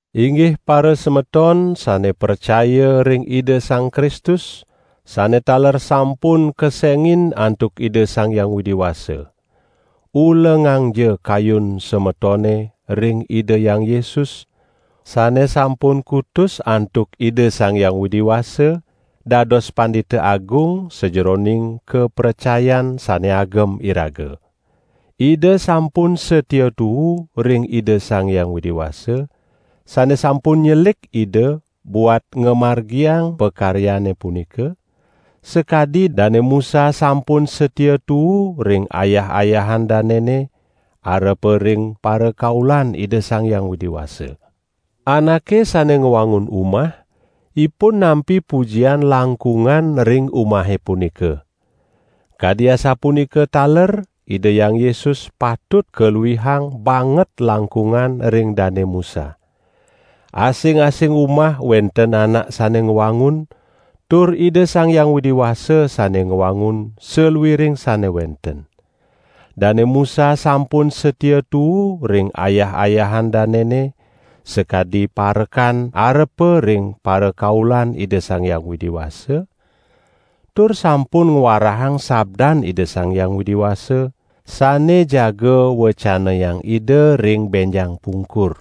Inggih parasemeton sane pracaya ring Ida Sang Kristus, sane taler sampun kesengin antuk Ida Sang Hyang Widi Wasa. Ulengangja kayun semetone ring Ida Hyang Yesus, sane sampun kutus antuk Ida Sang Hyang Widi Wasa dados Pandita Agung sajeroning kapracayan sane agem iraga. Ida sampun satia tuu ring Ida Sang Hyang Widi Wasa, sane sampun nyelik Ida buat ngamargiang pakaryane punika, sakadi Dane Musa sampun satia tuu ring ayah-ayahan danene arepa ring parakaulan Ida Sang Hyang Widi Wasa. Anake sane ngwangun umah, ipun nampi pujian langkungan ring umahe punika. Kadi asapunika taler Ida Hyang Yesus patut kaluihang banget langkungan ring Dane Musa. Asing-asing umah wenten anak sane ngwangun, tur Ida Sang Hyang Widi Wasa sane ngwangun saluiring sane wenten. Dane Musa sampun satia tuu ring ayah-ayahan danene sakadi parekan arepa ring parakaulan Ida Sang Hyang Widi Wasa, tur sampun ngwarahang sabdan Ida Sang Hyang Widi Wasa sane jaga wecanayang Ida ring benjang pungkur.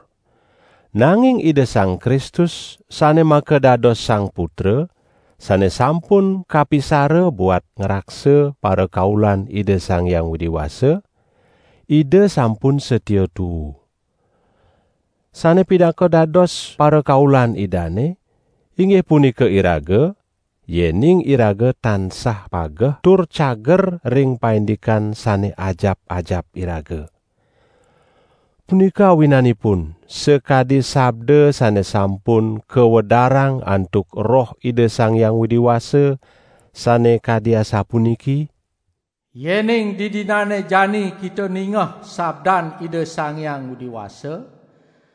Nanging Ida Sang Kristus sane makadados Sang Putra, sane sampun kapisara buat ngraksa parakaulan Ida Sang Hyang Widi Wasa, Ida sampun satia tuu. Sane pinaka dados parakaulan Idane, inggih punika iraga, yening iraga tansah pageh tur cager ring paindikan sane ajap-ajap iraga. Punika awinanipun, sakadi sabda sane sampun kawedarang antuk Roh Ida Sang Hyang Widi Wasa, sane kadi asapuniki: "Yening didinane jani kita ningeh sabdan Ida Sang Hyang Widi Wasa,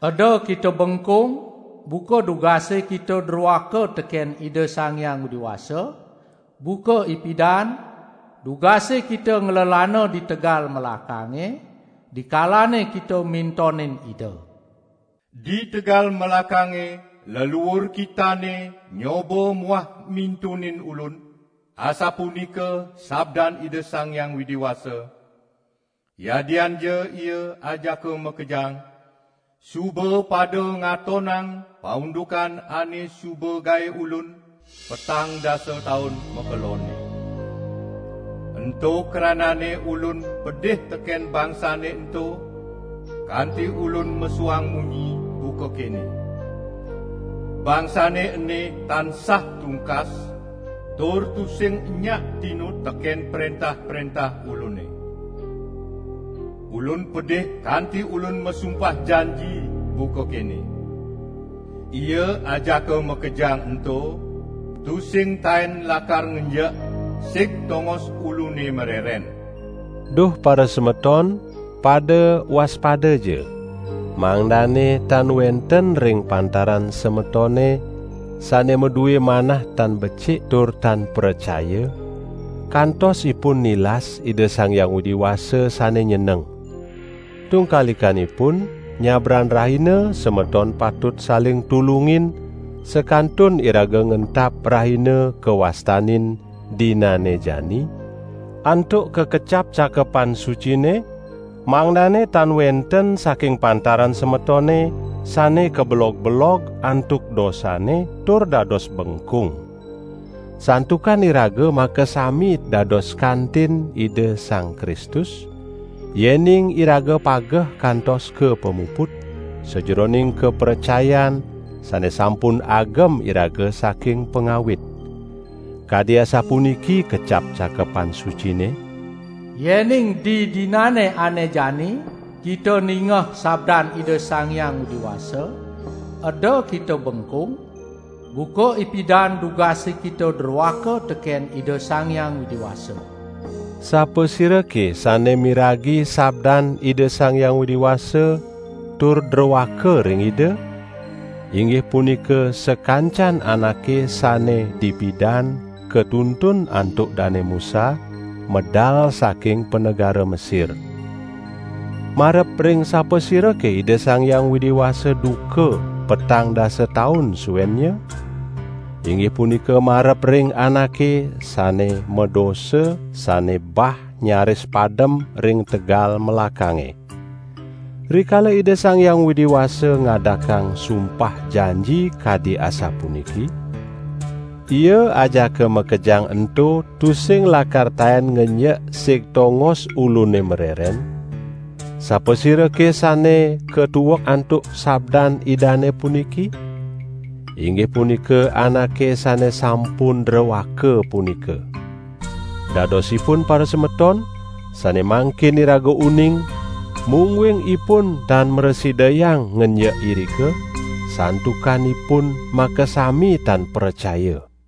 eda kita bengkung buka dugase kita droaka teken Ida Sang Hyang Widi Wasa, buka ipidan, dugase kita nglelana di tegal melakange, dikalane kita mintonin Ida. Di tegal melakange leluur kitane nyoba muah mintonin Ulun, asapunika sabdan Ida Sang Hyang Widi Wasa, yadianja ia ajaka makejang suba pada ngatonang paundukan ane suba gae Ulun petang dasa taun makelonne. Ento krananne Ulun pedih teken bangsane ento kanti Ulun mesuang munyi buka kene: 'Bangsane ene tansah tungkas tur tusing enyak tinut teken prentah-prentah Ulune.' Ulun pedih kanti Ulun masumpah janji buka kene: 'Ia ajaka makejang ento tusing taen lakar ngenjek sig tongos Ulune mareren.' " Duh parasemeton, pada waspadaja, mangdane tan wenten ring pantaran semetone, sane madue manah tan becik tur tan pracaya, kantos ipun nilas Ida Sang Hyang Widi Wasa sane nyeneng. Tungkalikanipun, nyabran rahina semeton patut saling tulungin sakantun iraga ngentap rahina kawastanin: "Dinane Jani", antuk kakecap Cakepan Sucine, mangdane tan wenten saking pantaran semetone sane kabelog-belog antuk dosane tur dados bengkung. Santukan iraga makasami dados kantin Ida Sang Kristus, yening iraga pageh kantos kapamuput sajeroning kapracayan sane sampun agem iraga saking pangawit. Kadi asapuniki kecap Cakepan Sucine: "Yening didinane ane jani kita ningeh sabdan Ida Sang Hyang Widi Wasa eda kita bengkung, buka ipidan dugase kita droaka teken Ida Sang Hyang Widi Wasa." Sapasirake sane miragi sabdan Ida Sang Hyang Widi Wasa tur droaka ring Ida? Inggih punika sakancan anake sane dipidan katuntun antuk Dane Musa, medal saking panegara Mesir. Marep ring sapasirake Ida Sang Hyang Widi Wasa duka petang dasa taun suennya? Inggih punika marep ring anake sane madosa, sane ebah ngraris padem ring tegal melakange. Rikala Ida Sang Hyang Widi Wasa ngadakang sumpah janji kadi asapuniki: "Ia ajaka makejang ento tusing lakar taen ngenjek sig tongos Ulune mareren", sapasirake sane katuek antuk sabdan Idane puniki? Inggih punika anake sane sampun droaka punika. Dadosipun parasemeton, sane mangkin iraga uning, mungguing ipun tan mrasidayang ngenjek irika, santukan ipun makasami tan pracaya.